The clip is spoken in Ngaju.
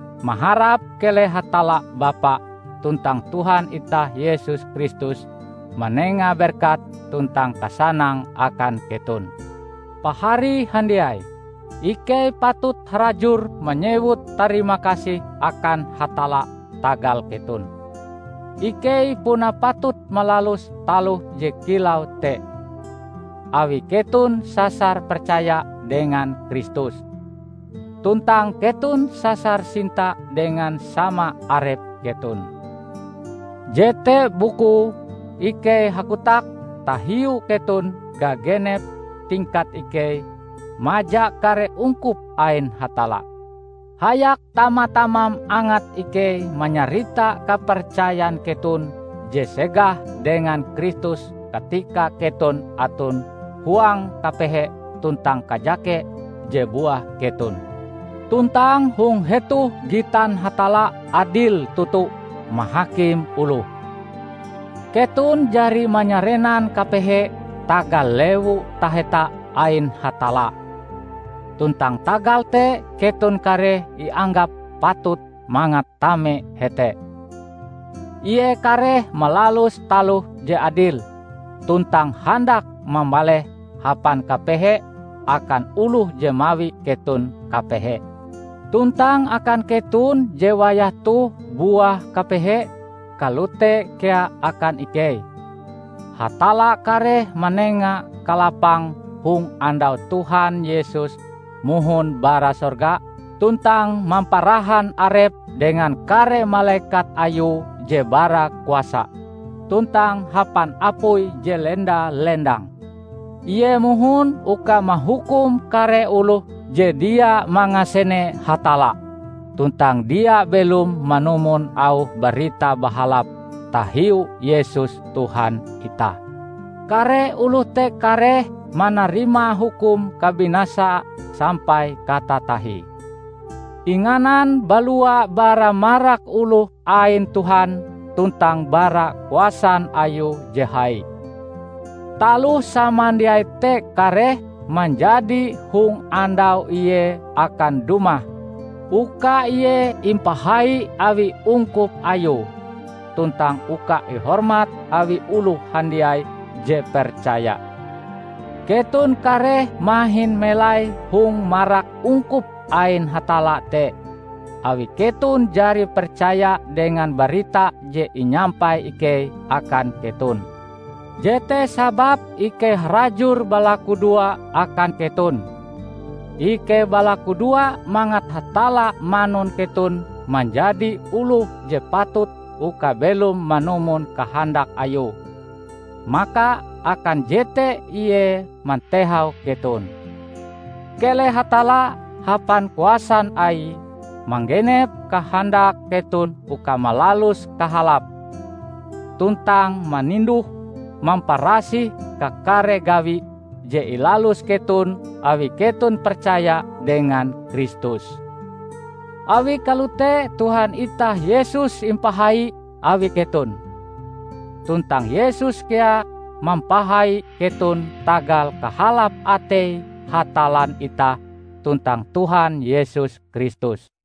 maharap keleh Hatalla Bapa tuntang Tuhan itah Yesus Kristus manenga berkat tuntang kasanang akan keton. Pahari handiai, ikei patut harajur manyewut tarimakasih akan Hatalla tagal keton. Ikei puna patut malalus taloh je kilau te, awi keton sasar percaya dengan Kristus, tuntang keton sasar sinta dengan sama arep keton. Jete bukue ikei hakotak tahiu keton gagenep tingkat ikei maja kare ungkup ain Hatalla. Hayak tama-tamam angat ikei manyarita kapercayan keton je segah dengan Kristus katika keton aton huang kapehe tuntang kajake je buah keton. Tuntang hong hetoh gitan Hatalla adil toto mahakim oloh: Keton jari manyarenan kapehe tagal Lewu Taheta ain Hatalla, tuntang tagal te keton kareh ianggap patut mangat tame hete. Ie kareh malalus taloh je adil, tuntang handak mambaleh hapan kapehe akan oloh je mawi keton kapehe. Tuntang akan keton je wayah toh buah kapehe -- kalote kea akan ikei -- Hatalla kareh manenga kalapang hong andau Tuhan Yesus mohon bara sorga tuntang mamparahan Arepe dengan kare malekat Ayue je bara kuasa tuntang hapan apui je lenda-lendang. Ie mohon uka mahukum kare oloh je dia mangasene Hatalla tuntang dia belom manumon auh Barita Bahalap tahiu Yesus Tuhan itah. Kare oloh te kareh manarima hukum kabinasa sampai katatahie, inganan balua bara marak oloh ain Tuhan tuntang bara kuasan Ayue je hai; taloh samandiai te kareh manjadi hong andau Ie akan dumah uka Ie impahai awi ungkup Ayue tuntang uka ihormat awi oloh handiai je percaya. Keton kareh mahin melai hong marak ungkup ain Hatalla te, awi keton jari percaya dengan barita je inyampai ikei akan keton. Jete sababe ikei harajur balakudoa akan keton. Ikei balakudoa mangat Hatalla manun keton manjadi oloh je patut uka belom manumon kahandak Ayue; maka akan jete Ie mantehau keton. Keleh Hatalla, hapan kuasan Aie, manggenep kahandak keton uka malalus kahalap, tuntang maninduh-mamparasih kakare gawi je ilalus keton awi keton percaya dengan Kristus. Awi kalote Tuhan itah Yesus impahai awi keton, tuntang Yesus kea mampahai keton tagal kahalap atei Hatallan itah tuntang Tuhan Yesus Kristus.